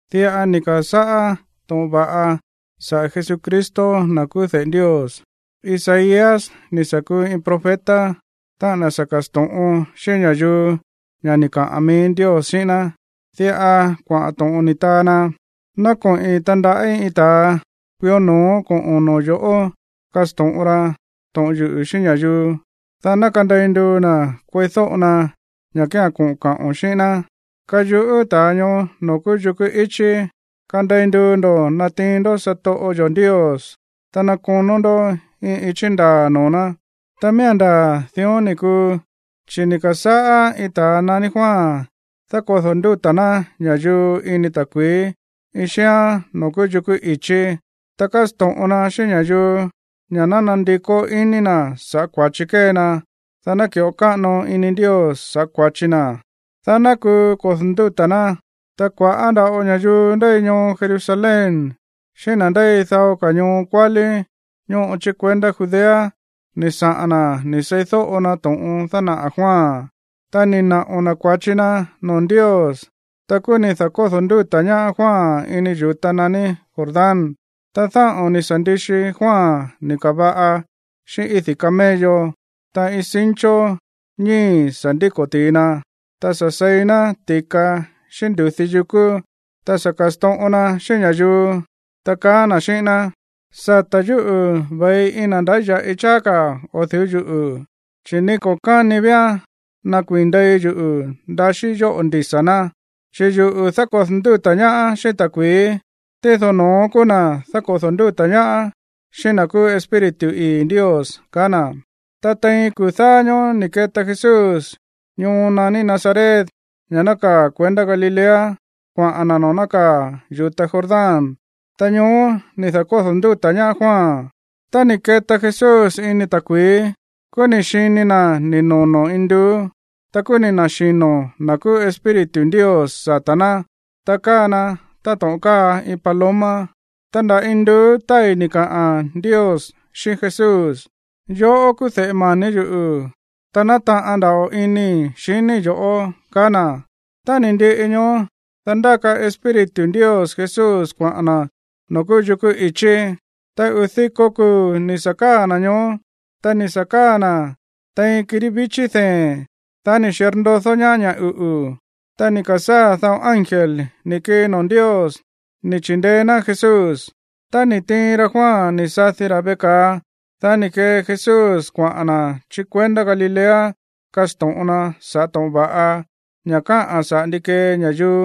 Diꞌa ni̱ ka̱sáꞌá to̱ꞌon va̱ꞌa saꞌa̱ Jesucristo, na̱ kúú de̱ꞌe Ndios. Isaías ni̱ sa̱ kuu iin profeta, táꞌa̱n na̱ sa̱ ka̱sto̱ꞌon xíꞌín ña̱yuu ña̱ ni̱ kaꞌa̱n mií Ndios xíꞌín ná. Diꞌa kuaꞌa̱n to̱ꞌon ni̱ taa na: Ná koꞌi̱n tandaꞌí iin ta̱a kuió no̱ó koꞌo̱n noo̱ yo̱ꞌó kasto̱ꞌon ra to̱ꞌon yuꞌu̱ xíꞌín ña̱yuu, dá ná kandei nduu na̱ kueídóꞌo na ña̱ kía̱n koꞌo̱n kaꞌo̱n xíꞌín ná. Kayuꞌú ta̱a ñoó noo̱ kúú yukú ichí: “Kandei nduu ndo̱ natiin ndó satoꞌo yo̱ Ndios, ta ná konó ndó iin ichí ndaa̱ noo̱ ná.” Ta miía̱n ndaa̱ dión ni̱ kuu, chi̱ ni̱ ka̱sáꞌá iin ta̱a naní Juan dákodo̱ ndúta̱ ná ña̱yuu ini ta̱kui̱í iin xíán noo̱ kúú yukú i̱chí. Ta kásto̱ꞌon na xíꞌín ña̱yuu ña̱ ná nandikó iní na̱ saꞌa̱ kua̱chi kée na, dá ná ki̱ꞌo káꞌano ini Ndios sa̱ꞌá kua̱chi na, dá ná kuu kodo̱ ndúta̱ ná. Ta kua̱ꞌá nda̱ꞌo ña̱yuu ndéi ñoo Jerusalén xíꞌín na̱ ndéi dao ka̱ ñoo kuálí ñóꞌo chí kuendá Judea ni̱ saꞌa̱n na̱ ni̱ seídóꞌo na to̱ꞌon dánaꞌa̱ Juan. Ta ni̱ naꞌo̱ na̱ kua̱chi na noo̱ Ndios. Ta kúú ni̱ da̱kódo̱ ndúta̱ ñaá Juan ini yu̱ta naní Jordán. Ta dáꞌo̱n ni̱ sa̱ ndixi Juan ni̱ ka̱va̱ꞌa xíꞌín ídi̱ camello. Ta iin cincho ñíi̱ sa̱ ndíko̱ ti̱i na. Ta sa̱ seí na̱ ti̱ka xíꞌín ndu̱dí yukú. Ta sa̱ ka̱sto̱ꞌon na xíꞌín ña̱yuu, ta kaá na̱ xíꞌín ná: ―Sa̱tá yuꞌu̱ ve̱i iin na̱ ndáya̱ꞌi cháá ka̱ o̱ du̱ú yuꞌu̱, chi̱ ni ko̱ káni vía̱n nakuii̱n ndei yuꞌu̱ ndaxíí yóꞌo̱ ndisa̱ ná. Chi̱ yuꞌu̱ dákodo̱ ndúta̱ ñaá xíꞌín ta̱kui̱í, tído no̱ón kúú na̱ dákodo̱ ndúta̱ ñaá xíꞌín na̱ kúú Espíritu ii̱ Ndios ―kaá na̱. Ta tein kuu̱ dáá ñóó ni̱ keta Jesús ñoo naní Nazaret, ña̱ nákaa̱ kuendá Galilea, kuaꞌa̱n na̱ noo̱ nákaa̱ yu̱ta Jordán. Ta ñoó ni̱ da̱kódo̱ ndúta̱ ñaá Juan. Tá ni̱ ke̱ta Jesús ini ta̱kui̱í, kúú ni̱ xini na̱ ni̱ nono̱ induú. Ta kúú ni̱ na̱xino̱ na̱ kúú Espíritu Ndios sata̱ ná, ta káa na̱ táto̱ꞌon káa iin paloma. Ta nda̱ induú tái̱ ni̱ kaꞌa̱n Ndios xíꞌín Jesús: ―Yoꞌó kúú de̱ꞌe mani̱ yuꞌu̱. Ta nátaꞌan nda̱ꞌo inii̱ xiníi̱ yo̱ꞌó ―kaá na̱. Tá ni̱ ndiꞌi ñoó, dá ndáka Espíritu Ndios Jesús kuaꞌa̱n na̱ noo̱ kúú yukú ichí. Ta uu̱ diko kuu̱ ni̱ sa̱ káa̱ na̱ ñoó. Ta ni̱ sa̱ káa̱ na̱ tein kirí víchi̱ dee̱n. Dá ni̱ xirndodó ñaá ña̱ uꞌu̱. Ta ni̱ ka̱sáa̱ dao ángel ni̱ kii noo̱ Ndios, ni̱ chi̱ndeé ná Jesús. Tá ni̱ tiin ra Juan ni̱ sadi ra̱ veꞌe ka̱a, dá ni̱ kee Jesús kuaꞌa̱n na̱ chí kuendá Galilea kasto̱ꞌon na saꞌa̱ to̱ꞌon va̱ꞌa, ña̱ káꞌa̱n saꞌa̱ ndi kee ña̱yuu,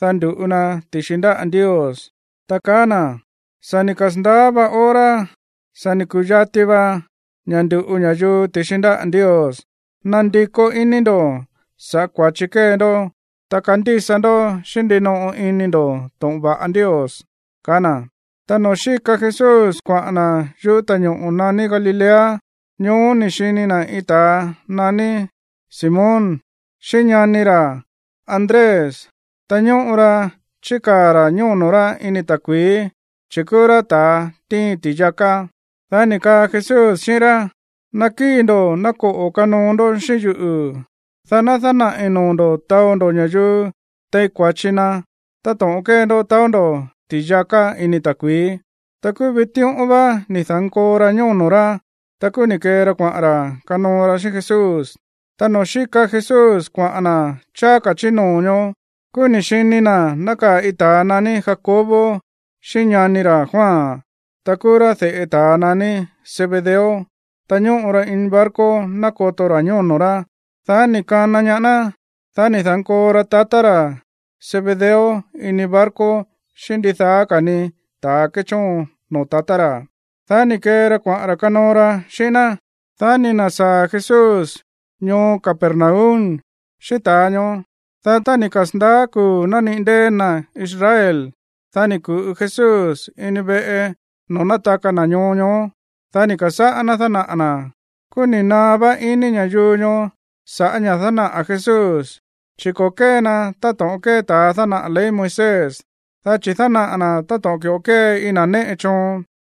dá ndu̱ꞌu na ti̱xi ndáꞌa̱ Ndios, ta kaá na̱: ―Sa̱ ni̱ kasa̱ndaá vá hora, sa̱ ni̱ ku̱yati va ña̱ ndu̱ꞌu ña̱yuu ti̱xi ndáꞌa̱ Ndios. ¡Nandikó iní ndo̱ sa̱ꞌá kua̱chi kée ndó, ta kandísa ndó xíꞌín ndinoꞌo ini ndo̱ to̱ꞌon va̱ꞌa Ndios! ―kaá na̱. Ta noo̱ xíka Jesús kuaꞌa̱n na̱ yúꞌu̱ ta̱ñoꞌo̱ naní Galilea, ñoó ni̱ xini na̱ iin ta̱a naní Simón xíꞌín ñani ra̱ Andrés. Ta ñóꞌo ra chíkaa̱ ra̱ ñóno̱ rá ini ta̱kui̱í, chi̱ kúú rá ta̱a tíin ti̱yaká. Dá ni̱ kaa Jesús xíꞌín rá: ―Ná kíi̱ ndo̱ ná koꞌo̱ kanoo ndó xíꞌín yuꞌu̱, dá ná dánaꞌi̱ noo̱ ndo̱ taó ndó ña̱yuu tein kua̱chi na táto̱ꞌon kée ndó taó ndó ti̱yaká ini ta̱kui̱í. Ta kúú vitíꞌón vá ni̱ da̱nkoo ra ñóno̱ rá. Ta kúú ni̱ kee ra kuaꞌa̱n ra̱ kanoo ra xíꞌín Jesús. Ta noo̱ xíka Jesús kuaꞌa̱n na̱ cháá ka̱ chí noo̱ ñoó, kúú ni̱ xini na̱ nákaa̱ iin ta̱a naní Jacobo xíꞌín ñani ra̱ Juan, ta kúú rá de̱ꞌe ta̱ naní Zebedeo. Ta ñóꞌo ra ini barco nákoto ra̱ ñóno̱ rá. Dá ni̱ kana ñaá ná. Dá ni̱ da̱nkoo ra tatá ra̱ Zebedeo ini barco xíꞌín ndidaá ka̱ ni ta̱a kéchóon noo̱ tatá ra̱. Dá ni̱ kee ra kuaꞌa̱n ra̱ kanoo ra xíꞌín ná. Dá ni̱ na̱sáa̱ Jesús ñoo Capernaum xíꞌín ta̱a ñoó. Dá tá ni̱ kasa̱ndaá kuu̱ nániꞌi̱ ndée̱ na̱ Israel, dá ni̱ ku̱ꞌu Jesús ini veꞌe noo̱ nátaka na̱ ñoo ñoó. Dá ni̱ ka̱sáꞌá ná dánaꞌa̱ na̱. Kúú ni̱ naá vá iní ña̱yuu ñoó sa̱ꞌá ña̱ dánaꞌa̱ Jesús, chi̱ ko̱ kée na táto̱ꞌon kée ta̱a dánaꞌa̱ ley Moisés, dá chi̱ dánaꞌa̱ na̱ táto̱ꞌon ki̱ꞌo kée iin na̱ néꞌe choon.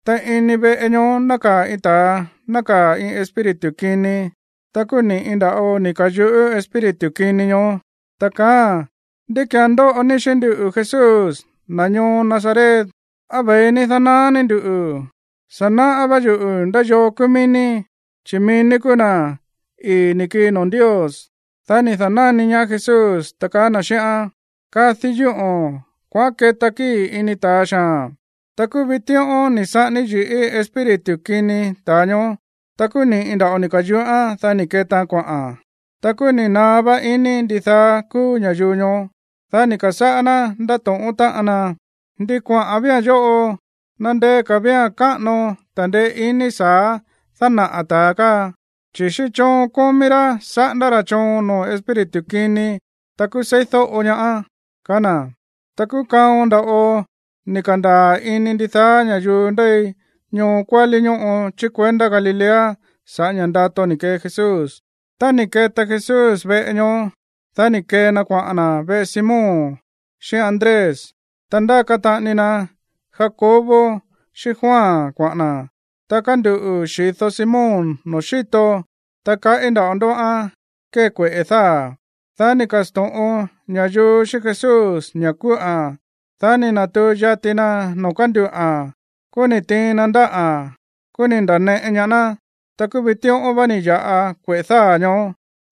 Ta ini veꞌe ñoó nákaa̱ iin ta̱a nákaa̱ iin espíritu kini. Ta kúú ni̱ꞌi nda̱ꞌo ni̱ ka̱yuꞌú espíritu kini ñoó, ta kaáa̱n: ―¿Ndi ki̱án ndóꞌo ní xíꞌín nduꞌu̱, Jesús, na̱ ñoo Nazaret? ¿Á ve̱i ní dánaá ní nduꞌu̱? Sa̱ náꞌá vá yuꞌu̱ ndá yoo kúú mií ní, chi̱ mií ní kúú na̱ ii̱ ni̱ kii noo̱ Ndios. Dá ni̱ da̱náni ñaá Jesús, ta kaá na̱ xíꞌán: ―¡Kadi yúꞌo̱n! ¡Kuaꞌán keta kíi̱ ini ta̱a xaa̱n! Ta kúú vitíꞌón ni̱ saꞌání yi̱ꞌí espíritu kini ta̱a ñoó. Ta kúú ni̱ꞌi nda̱ꞌo ni̱ ka̱yuꞌán, dá ni̱ ketaan kuaꞌa̱n. Ta kúú ni̱ naá vá iní ndidaá kúú ña̱yuu ñoó, dá ni̱ ka̱sáꞌá ná ndátóꞌón táꞌan ná: ―¿Ndi kuaꞌa̱n vía̱n yóꞌo? Na̱ ndeé ka̱ vía̱n káꞌano ta̱ndeé iní sa̱á dánaꞌa̱ ta̱a káa, chi̱ xíꞌín choon kómí rá saꞌándá ra̱ choon noo̱ espíritu kini, ta kúú seídóꞌo ñaa̱n ―kaá na̱. Ta kúú kaon nda̱ꞌo ni̱ ka̱ndaa̱ ini ndidaá ña̱yuu ndéi ñoo kuálí ñóꞌo chí kuendá Galilea saꞌa̱ ña̱ ndato ni̱ kee Jesús. Tá ni̱ keta Jesús veꞌe ñoó, dá ni̱ kee na kuaꞌa̱n na̱ veꞌe Simón xíꞌín Andrés, ta ndáka taꞌani na Jacobo xíꞌín Juan kuaꞌa̱n na̱. Ta kánduꞌu̱ xi̱do Simón noo̱ xíto, ta kaꞌí nda̱ꞌo ndóꞌán kée kueꞌe̱ dáa̱. Dá ni̱ ka̱sto̱ꞌon ña̱yuu xíꞌín Jesús ña̱ kúꞌa̱n. Dá ni̱ na̱tuu yati na noo̱ kánduꞌa̱n. Kúú ni̱ tiin na ndáꞌa̱n. Kúú ni̱ nda̱neꞌe ñaá ná. Ta kúú vitíꞌón vá ni̱ ya̱ꞌa kueꞌe̱ dáa̱ ñoó.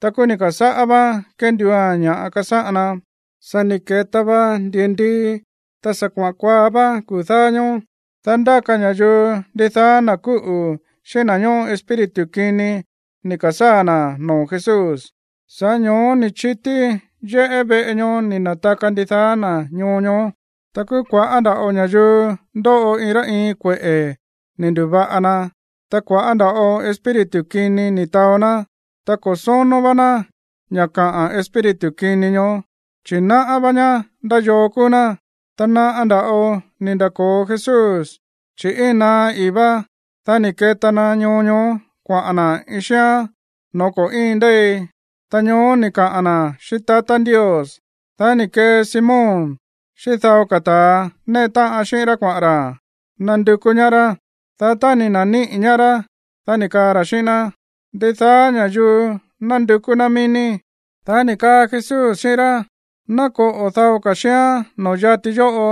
Ta kúú ni̱ ka̱sáꞌá váán kénduua̱n ña̱ kasáꞌan na. Sa̱ ni̱ keta va ndi̱ndii, ta sa̱ kuaꞌa̱n kuaá vá kuu̱ dáá ñóó, dá ndáka ña̱yuu ndidaá na̱ kúꞌu̱ xíꞌín na̱ ñóꞌo espíritu kini ni̱ ka̱sáa̱ na̱ noo̱ Jesús. Sa̱ꞌá ño̱ó ni̱ chití yéꞌé veꞌe ñoó ni̱ na̱taka ndidaá na̱ ñoo ñoó. Ta kúú kua̱ꞌá nda̱ꞌo ña̱yuu ndóꞌo iin rá iin kueꞌe̱ ni̱ ndu̱va̱ꞌa na, ta kua̱ꞌá nda̱ꞌo espíritu kini ni̱ taó ná. Ta ko̱ sónó vá ná ña̱ kaꞌa̱n espíritu kini ñoó, chi̱ náꞌá vá ñá ndá yoo kúú ná. Ta naꞌa nda̱ꞌo ni̱ nda̱ko̱o Jesús, chi̱ íin naá i̱í vá. Dá ni̱ keta na ñoo ñoó kuaꞌa̱n na̱ iin xíán no̱ó ko̱ íin ndéi. Ta ñoó ni̱ kaꞌa̱n na̱ xíꞌín tatá Ndios. Dá ni̱ kee Simón xíꞌín dao ka̱ ta̱ néꞌe táꞌan xíꞌín rá kuaꞌa̱n ra̱ nandukú ñaá rá. Dá tá ni̱ na̱níꞌi̱ ñaá rá, dá ni̱ kaa ra̱ xíꞌín ná: ―Ndidaá ña̱yuu nándukú ná mií ní. Dá ni̱ kaa Jesús xíꞌín rá: ―Ná koꞌo̱ dao ka̱ xíán noo̱ yati yóꞌo,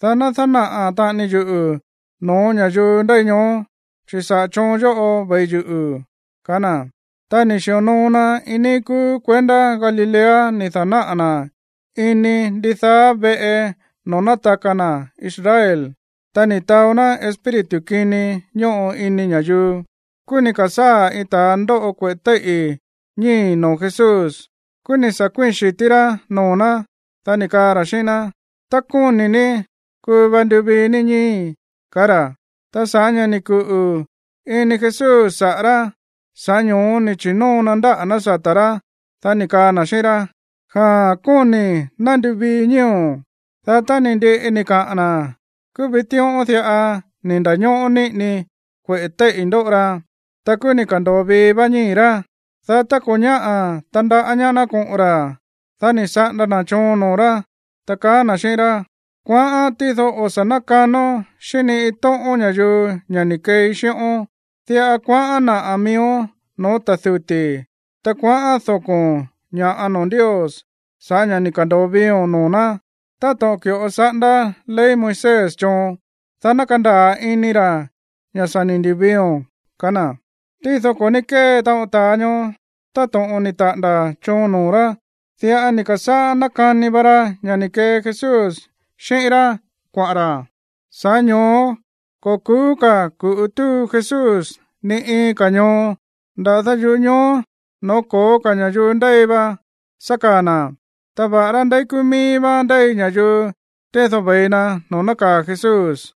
dá ná dánaꞌa̱ taꞌani yuꞌu̱ no̱ó ña̱yuu ndéi ñoó, chi̱ sa̱ꞌá choon yóꞌo ve̱i yuꞌu̱ ―kaá na̱. Ta ni̱ xi̱onoo na iin níí kúú kuendá Galilea ni̱ da̱náꞌa̱ na̱ ini ndidaá veꞌe noo̱ nátaka na̱ Israel, ta ni̱ taó ná espíritu kini ñóꞌo ini ña̱yuu. Kúú ni̱ ka̱sáa̱ iin ta̱a ndóꞌo kueꞌe̱ téíꞌi̱ ñíi̱ noo̱ Jesús. Kúú ni̱ sa̱ kuíi̱n xi̱tí rá noo̱ ná, dá ni̱ kaa ra̱ xíꞌín ná: ―Tá kóni̱ ní, kuu va nduvii ní ñíi̱í ―kaá ra̱. Ta sa̱ꞌá ña̱ ni̱ kuꞌu̱ ini Jesús saꞌa̱ rá, sa̱ꞌá ño̱ó ni̱ chi̱nóo na ndáꞌa̱ ná sata̱ rá, dá ni̱ kaa na̱ xíꞌín rá: ―Jaa̱n, kóni̱i̱. Ná nduvií ñíi̱o̱n. Dá tá ni̱ ndiꞌi ni̱ kaꞌa̱n na̱, kúú vitíꞌón diꞌa ni̱ nda̱ñóꞌó niꞌini kueꞌe̱ téíꞌi̱ ndóꞌo ra. Ta kúú ni̱ ka̱ndo̱o vii vá ñíi̱ rá. Dá tá ko̱ ñáꞌa̱ tandaꞌá ñaá ná koꞌo̱n ra̱, dá ni̱ saꞌanda na̱ choon noo̱ rá, ta kaá na̱ xíꞌín rá: ―Kuaꞌán, tído o̱ sa̱ nákanón xíꞌín ni iin tóꞌón ña̱yuu ña̱ ni̱ keei xíꞌón. Diꞌa kuaꞌán naꞌa̱ miíón no̱ó ta̱ duti̱. Ta kuaꞌán doko̱ ña̱ꞌa noo̱ Ndios sa̱ꞌá ña̱ ni̱ ka̱ndo̱o viio̱n noo̱ ná, táto̱ꞌon ki̱ꞌo saꞌándá ley Moisés choon, dá ná kandaa̱ ini ra̱ ña̱ sa̱ ni̱ ndu̱viio̱n ―ka̱á na̱. Tído ko̱ ní kée taꞌon ta̱a ñoó táto̱ꞌon ni̱ taꞌa̱nda̱ choon noo̱ rá. Diꞌa ni̱ ka̱sáꞌá nákani va ra ña̱ ni̱ kee Jesús xíꞌín rá kuaꞌa̱n ra̱. Sa̱ꞌá ño̱ó ko̱ ku̱ú ka̱ ku̱ꞌu túu Jesús ni iin ka̱ ñoo. Nda̱dá yuꞌú ñoo no̱ó ko̱ó ka̱ ña̱yuu ndéi va sa̱ káa̱ na̱. Ta va̱ꞌará ndeí kúú míí vá ndéi ña̱yuu, tído ve̱i na noo̱ nákaa̱ Jesús.